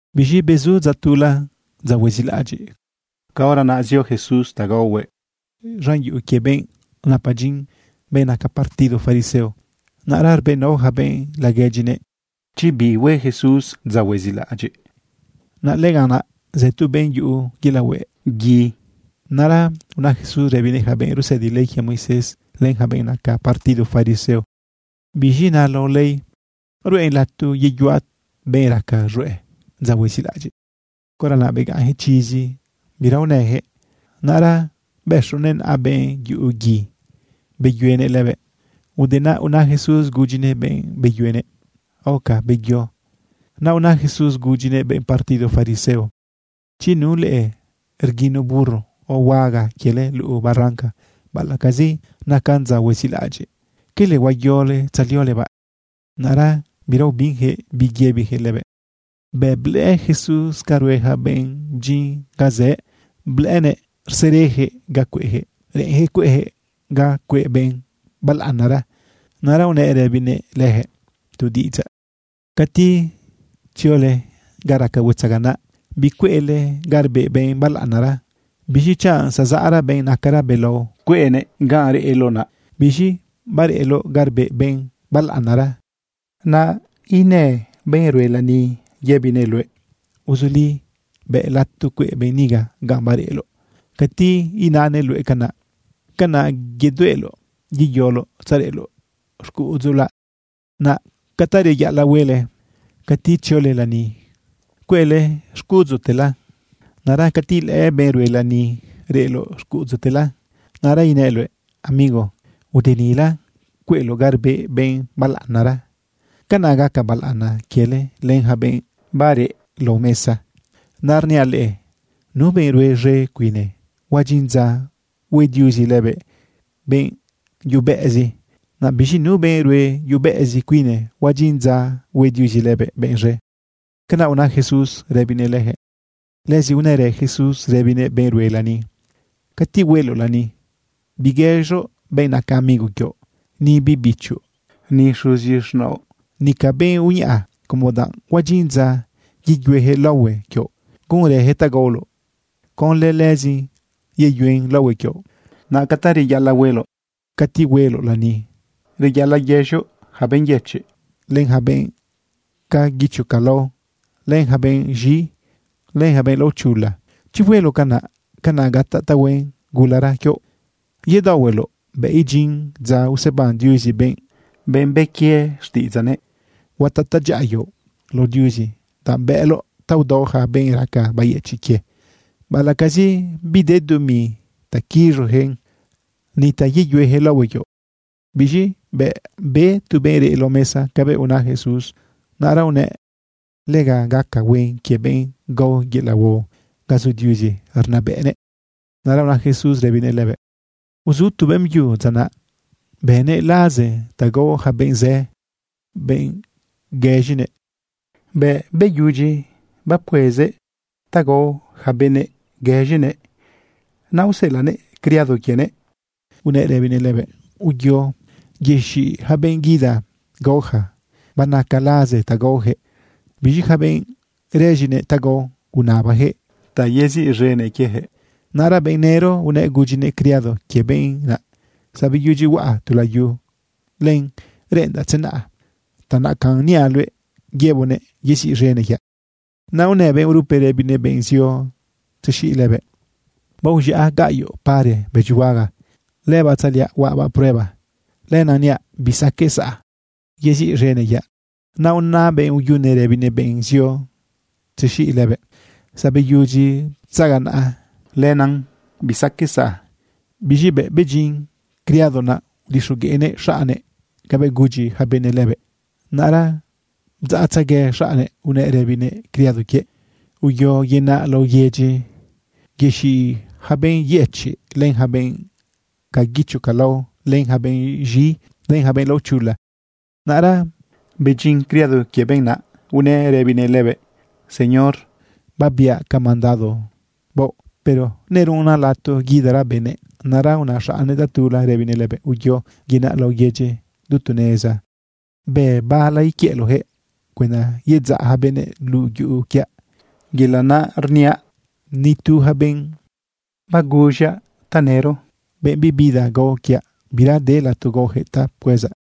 Biz̃i bezu dza tula, dza huezilaꞌadyiꞌ. Caora naꞌ zio Jesús ta gaohuëꞌ z̃an yuꞌu quie benꞌ napa dyin, benꞌ naca partido fariseo. Naꞌra rbëꞌnao yaca benꞌ laguedyinëꞌ chi bi hue Jesús dza huezilaꞌadyiꞌ. Naꞌ lëganꞌ naꞌ zë tu benꞌ yuꞌu yelaꞌ hueꞌ gui. Naꞌra una Jesús rëbinëꞌ yaca benꞌ rusëdi ley quie Moisés, len yaca benꞌ naca partido fariseo: ―¿Biz̃i na lao ley? ¿Ruꞌen lato yeyuaꞌ benꞌ raca z̃hueꞌ dza huezilaꞌadyiꞌ? Caora naꞌ begaꞌnyaquëꞌ chizi, bira unëyaquëꞌ. Naꞌra bëxunëꞌ naꞌa benꞌ yuꞌu gui, beyuenëꞌ lëbëꞌ. Ude naꞌ una Jesús gudyinëꞌ benꞌ beyuenëꞌ: “Aoca, beyo.” Naꞌ una Jesús gudyinëꞌ benꞌ partido fariseo: ―Chi nu leꞌe rguino burro o huaga quiele luꞌu barranca, baꞌalaꞌcazi nacan dza huezilaꞌadyiꞌ, ¿quele huayole tzaliolebaꞌ? Naꞌra bira ubinyaquëꞌ bi yëbiyaquëꞌ lëbëꞌ. Bëꞌ blëꞌë Jesús ca rue yaca benꞌ bdyin ga zëꞌë, blëꞌënëꞌ rsereyaquëꞌ ga cueꞌyaquëꞌ reꞌenyaquëꞌ cueꞌyaquëꞌ ga cueꞌ benꞌ balaꞌanara. Naꞌ unëꞌ rëbinëꞌ leyaquëꞌ tu diꞌidzaꞌ: ―Cati ziole ga raca huetzaganaꞌ, bicueꞌle ga rbeꞌ benꞌ balaꞌanara. Biz̃i chanꞌ zazaꞌra benꞌ nacara belao cueꞌnëꞌ ganꞌ reꞌloꞌ naꞌ. Biz̃i bareꞌloꞌ ga rbeꞌ benꞌ balaꞌanara, naꞌ inë benꞌ rue lani yëbinëꞌ luëꞌ: “Uzuli, bëꞌ lato cueꞌ benꞌ niga ganꞌ bareꞌloꞌ.” Cati inanëꞌ luëꞌ canaꞌ, canaꞌ yedueꞌloꞌ yeyoloꞌ tzareꞌloꞌ xcuꞌudzula. Naꞌ ca ta reyaꞌalaꞌ huele cati tziole lani, cueꞌle xcuꞌudzutela. Naꞌra cati ilëꞌë benꞌ rue lani reꞌloꞌ xcuꞌudzutela, naꞌra inëꞌ luëꞌ: “Amigo, ude nila cueꞌloꞌ ga rbeꞌ benꞌ balaꞌanara.” Canaꞌ gaca balaꞌana quiele len yaca benꞌ bareꞌ lao mesa. Naꞌ rniaꞌ leꞌe, nu benꞌ rue z̃e cuine, huadyin dza hue Diuzi lëbëꞌ benꞌ yubeꞌezi. Naꞌ biz̃i nu benꞌ rue yubeꞌezi cuine, huadyin dza hue Diuzi lëbëꞌ benꞌ z̃e. ―Canaꞌ una Jesús rëbinëꞌ leyaquëꞌ. Lëzi unërë Jesús rëbinëꞌ benꞌ rue lani: ―Cati hueloꞌ lani biguëz̃oꞌ benꞌ naca amigo quioꞌ, ni biꞌ bichoꞌ, ni xuzi z̃naoꞌ, nica benꞌ uñaꞌa, como danꞌ huadyin dza yeyueyaquëꞌ laohue quioꞌ, gunrëyaquëꞌ ta gaoloꞌ. Conlë lëzin yeyuen laohue quioꞌ. Naꞌ ca ta reyaꞌalaꞌ hueloꞌ cati hueloꞌ lani, reyaꞌalaꞌ guëz̃oꞌ yaca benꞌ yëchiꞌ, len yaca benꞌ ca guicho ca lao, len yaca benꞌ z̃i, len yaca benꞌ laochula. Chi hueloꞌ canaꞌ, canaꞌ gataꞌ tahuen gulara quioꞌ yedaohueloꞌ bëꞌ idyin dza useban Diuzi benꞌ bë quie xtiꞌidzaꞌnëꞌ. Huataꞌ tadyaꞌa quioꞌ lao Diuzi danꞌ bëꞌloꞌ ta udao yaca benꞌ raca bayëchiꞌ quie, baꞌalaꞌcazi bide dumi ta quiz̃oyaquëꞌn ni ta yeyueyaquëꞌ laohue quioꞌ. Biz̃i bëꞌ be tu benꞌ reꞌ lao mesa cabëꞌ una Jesús, naꞌra unëꞌ: ―Lega gaca huen quie benꞌ gao yelaꞌ huao ga zu Diuzi rnabëꞌnëꞌ. Naꞌra una Jesús rëbinëꞌ lëbëꞌ: ―Uzu tu beꞌmbyu dza naꞌ, bëꞌnëꞌ laze ta gao yaca benꞌ zë, benꞌ guëz̃inëꞌ. Bëꞌ beyudyi bapcuezëꞌ ta gao yaca benëꞌ guëz̃inëꞌ, naꞌ useꞌelaꞌnëꞌ criado quienëꞌ unëꞌ rëbinëꞌ lëbëꞌ: “Uyo, yexiꞌ yaca benꞌ guida gao yaca. Banaca laze ta gaoyaquëꞌ.” Biz̃i yaca benꞌ rëz̃inëꞌ ta gao, unabayaquëꞌ ta yeziꞌz̃enëꞌ quieyaquëꞌ. Naꞌra benꞌ nëro unëꞌ gudyinëꞌ criado quie benꞌ naꞌ: “Zabeyudyi huaꞌa tu layu. Len reꞌendaꞌ tzenaꞌa. Ta nacanꞌ niaꞌ luëꞌ yëboꞌnëꞌ yeziꞌz̃enëꞌ quiaꞌ.” Naꞌ unë benꞌ urupe rëbinëꞌ benꞌ zio tzexiꞌ lëbëꞌ: “Baoz̃iaꞌ gaꞌyoꞌ pare bëdyihuaga. Lëbaꞌ tzaꞌliaꞌ huaꞌbaꞌ prueba. Lenaꞌ niaꞌ bisaqueꞌ saꞌa, yeziꞌz̃enëꞌ quiaꞌ.” Naꞌ una benꞌ uyune rëbinëꞌ benꞌ zio tzexiꞌ lëbëꞌ: “Zabeyudyi ptzaganaꞌa. Yelaꞌ naꞌ bisaqueꞌ saꞌa.” Biz̃i bëꞌ bedyin criado, naꞌ udixogueꞌnëꞌ xaꞌnnëꞌ cabëꞌ gudyi yaca benëꞌ lëbëꞌ. Naꞌra bdzaꞌtzegue xaꞌnnëꞌ unëꞌ rëbinëꞌ criado quiëꞌ: “Uyo yenaꞌ laꞌo yedyi, yexiꞌ yaca benꞌ yëchiꞌ, len yaca benꞌ ca guicho ca lao, len yaca benꞌ z̃i, len yaca benꞌ laochula.” Naꞌra bedyin criado quie benꞌ naꞌ unëꞌ rëbinëꞌ lëbëꞌ: “Señor, babiaꞌ ca mandado baoꞌ. Pero nerunnan lato guidara benëꞌ.” Naꞌra una xaꞌnnëꞌ tatula rëbinëꞌ lëbëꞌ: “Uyo yenaꞌ laꞌo yedyi du tu neza. Bë bala iquiëꞌloꞌyaquëꞌ cuenda yedzaꞌ yaca benëꞌ luꞌu yuꞌu quiaꞌ. Yelaꞌ naꞌ rniaꞌ, ni tu yaca benꞌ baguz̃aꞌ tanëro, benꞌ bibida gao quiaꞌ, bira de lato gaoyaquëꞌ ta pcuezaꞌ.”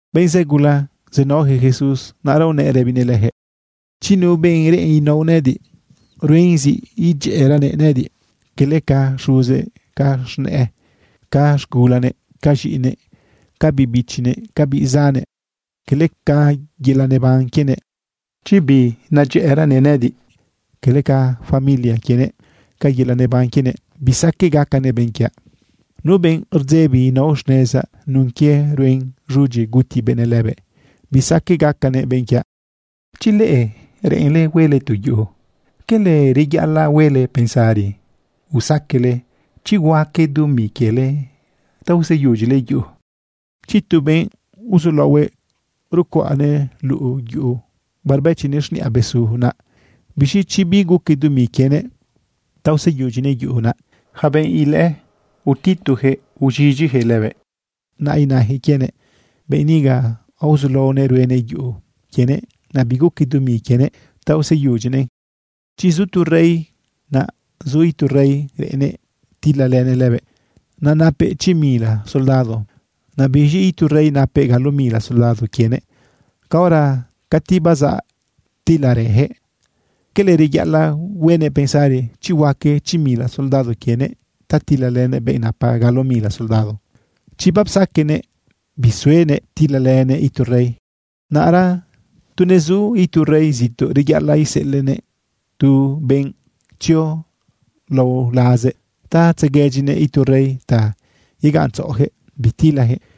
Benꞌ zë gula zenaoyaquëꞌ Jesús. Naꞌra unëꞌ rëbinëꞌ leyaquëꞌ: ―Chi nu benꞌ reꞌen inao nëꞌëdiꞌ, ruen zi idyëꞌëranëꞌ nëꞌëdiꞌ cala ca xuzëꞌ, ca z̃nëꞌë, ca z̃gulanëꞌ, ca z̃iꞌinëꞌ, ca biꞌ bichinëꞌ, ca biꞌ zannëꞌ, cala ca yelaꞌ neban quienëꞌ. Chi binedyëꞌëranëꞌ nëꞌëdiꞌ cala ca familia quienëꞌ, ca yelaꞌ neban quienëꞌ, bisaqueꞌ gacanëꞌ benꞌ quiaꞌ. Nu benꞌ rdzebi inao xnezaꞌ nun quie ruen z̃udyi guti benëꞌ lëbëꞌ, bisaqueꞌ gacanëꞌ benꞌ quiaꞌ. Chi leꞌe reꞌenle huele tu yuꞌu ¿cala reyaꞌalaꞌ huele pensari usaqueꞌle chi huaque dumi quiele ta useyudyile yuꞌu? Chi tu benꞌ uzulaohue rcuaꞌnëꞌ luꞌu yu barbëchinëꞌ xniꞌa besu, naꞌ biz̃i chi biguque dumi quienëꞌ ta useyudyinëꞌ yuꞌu, naꞌ yaca benꞌ ilëꞌë, utituyaquëꞌ uz̃idyiyaquëꞌ lëbëꞌ. Naꞌ inayaquëꞌ quienëꞌ: “Benꞌ niga aozulaonëꞌ ruenëꞌ yuꞌu quienëꞌ, naꞌ biguque dumi quienëꞌ ta useyudyinëꞌn.” Chi zu tu rey, naꞌ zu itu rey reꞌennëꞌ tilalënëꞌ lëbëꞌ. Naꞌ napëꞌ chi mila soldado. Naꞌ biz̃i itu rey napëꞌ galo mila soldado quienëꞌ. Caora cati bazaꞌ tilarëyaquëꞌ, ¿cala reyaꞌalaꞌ huenëꞌ pensari chi huaque chi mila soldado quienëꞌ ta tilalënëꞌ benꞌ napa galo mila soldado? Chi bapsaquenëꞌ bisuenëꞌ tilalënëꞌ itu rey, naꞌra tu nezu itu rey zituꞌ, reyaꞌalaꞌ iseꞌelaꞌnëꞌ tu benꞌ tzio lao lazëꞌ ta tzeguedyinëꞌ itu rey ta yegaꞌntzaꞌoyaquëꞌ bitilayaquëꞌ.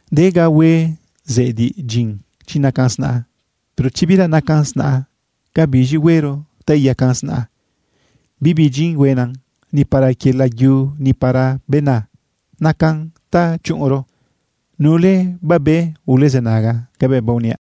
―De ga hue zediꞌdyin chi nacan snaꞌa. Pero chi bira nacan snaꞌa, ¿ca biz̃i huero ta iyacan snaꞌa? Bibi dyin huena, ni para quie layu, ni para bena. Nacan ta chuꞌunro. Nule babe, ulezënaga cabëꞌ baoniaꞌ.